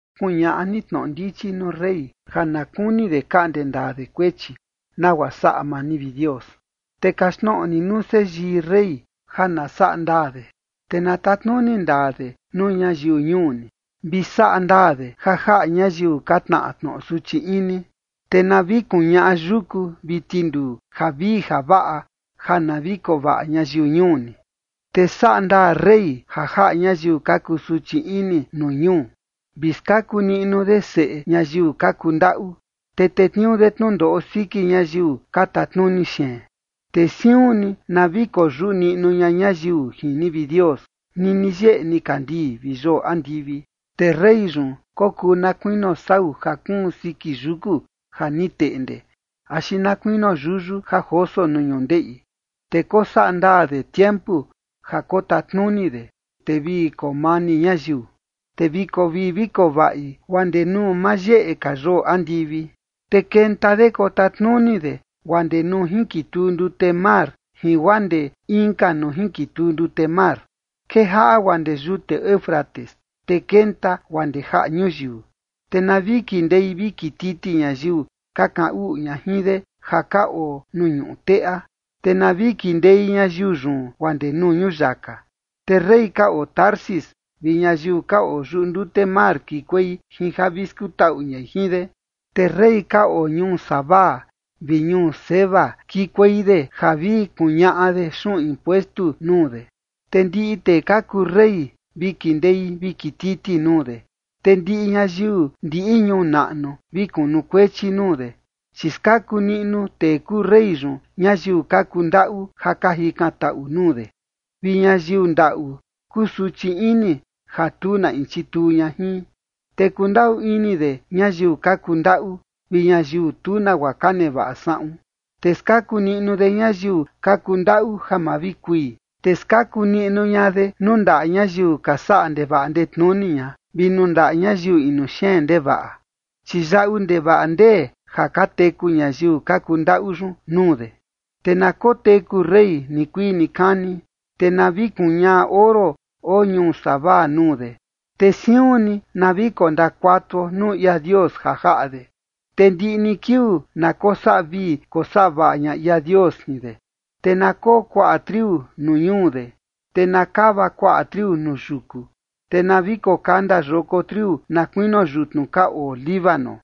Kuñaꞌa ni tnoꞌo ndichi nuu rey ja na kuni de kaꞌnde ndaa de kuechi nagua saꞌa maa ni, vi Dios, te kaxtnoꞌo ni nuu seyii rey ja na saꞌa ndaa de. Te na tatnuni ndaa de nuu ñayiu ñuu ni, vi saꞌa ndaa de ja jaꞌa ñayiu ka tnaꞌa tnoꞌo suchi ini. Te na vi kuñaꞌa yuku vi tinduu javii javaꞌa ja na vi koo vaꞌa ñayiu ñuu ni. Te saꞌa ndaa rey ja jaꞌa ñayiu ka kusuchi ini nuu ñuu, vi skaku niꞌnu de seꞌe ñayiu ka kundaꞌu, te tetniuu de tnundoꞌo siki ñayiu ka tatnuni xeen. Te siun ni na vi koyuꞌu niꞌnu ña ñayiu jin ni, vi Dios, nini yeꞌe nikandii vi yoo andivi. Te rey yun kokuu na kuinio sau ja kuun siki yuku ja ni teꞌnde axi na kuinio yuyu ja joso nuu ñundeꞌi. Te kosaꞌa ndaa de tiempu ja kotatnuni de, te vi koo mani ñayiu, te vi koo vii vi koo vaꞌi, guaa ndee nuu ma yeꞌe ka yoo andivi. Te kenta de kotatnuni de guaa ndee nuu jinkituu ndute mar jin guaa ndee inka nuu jinkituu ndute mar. Kejaꞌa guaa ndee yute Éufrates te kenta guaa ndee jaꞌa ñuyiu. Te na vi kindei vi kititi ñayiu ka kaꞌan uꞌu ña jin de ja ka oo nuu ñuꞌu teꞌa, te na vi kindei ñayiu yun guaa ndee nuu ñuyaka. Te rey ka oo Tarsis vi ñayiu ka oo yuꞌu ndute mar kikuei jin ja vi skutaꞌu ñai jin de. Te rey ka oo ñuu Sabá vi ñuu Seba kikuei de ja vi kuñaꞌa de xuꞌun impuestu nuu de. Te ndiꞌi tee ka kuu rey vi kindei vi kititi nuu de. Te ndiꞌi ñayiu ndiꞌi ñuu naꞌnu vi kunukuechi nuu de. Chi skaku niꞌnu tee kuu rey yun ñayiu ka kundaꞌu ja ka jikantaꞌu nuu de, vi ñayiu ndaꞌu kusuchi ini ja tu na in chituu ña jin. Te kundaꞌu ini de ñayiu ka kundaꞌu vi ñayiu tu nagua ka nevaꞌa saꞌun, te skaku niꞌnu de ñayiu ka kundaꞌu ja ma vi kui. Te skaku niꞌnu ña de nuu ndaꞌa ñayiu ka saꞌa ndevaꞌa ndetnuni ña vi nuu ndaꞌa ñayiu inu xeen ndevaꞌa, chi yaꞌu ndevaꞌa ndee ja ka teku ñayiu ka kuu ndaꞌu yun nuu de. Te na koteku rey nikuii nikani, te na vi kuñaꞌa oro oo ñuu Sabá nuu de, te siun ni na vi kondakuatuo nuu ia Dios ja jaꞌa de, te ndiꞌi ni kiuu na kosaꞌa vii kosaꞌa vaꞌa ña ia Dios jin de. Te na koo kuaꞌa triu nuu ñuu de, te na kava kuaꞌa triu nuu yuku, te na vi kokanda yoko triu na kuinio yutnu ka oo Líbano,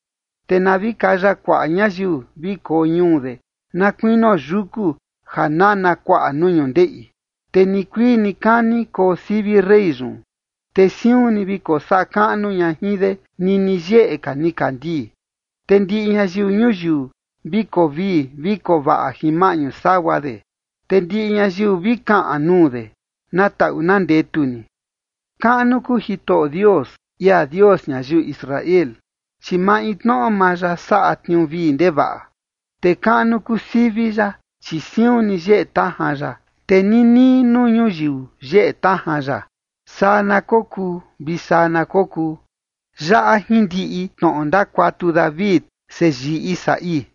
te na vi kaya kuaꞌa ñayiu vi koo ñuu de na kuinio yuku ja nana kuaꞌa nuu ñundeꞌi. Te nikuii nikani koo sivi rey yun, te siun ni vi kosaꞌa kaꞌnu ña jin de nini yeꞌe ka nikandii. Te ndiꞌi ñayiu ñuyiu vi koo vii vi koo vaꞌa jin maꞌñu sagua de, te ndiꞌi ñayiu vi kaꞌan nuu de: “Na taꞌu na ndetu ni”. Kaꞌnu kuu Jitoꞌo Dios, ia Dios ñayiu Israel, chi maintnoꞌo maa ya saꞌa tniuu vii ndevaꞌa. Te kaꞌnu kuu sivi ya, chi siun ni yeꞌe tajan ya, te ninii nuu ñuyiu yeꞌe tajan ya. Saa na kokuu vi saa na kokuu. Yaꞌa jindiꞌi tnoꞌo ndakuatu David, seyii Isaí.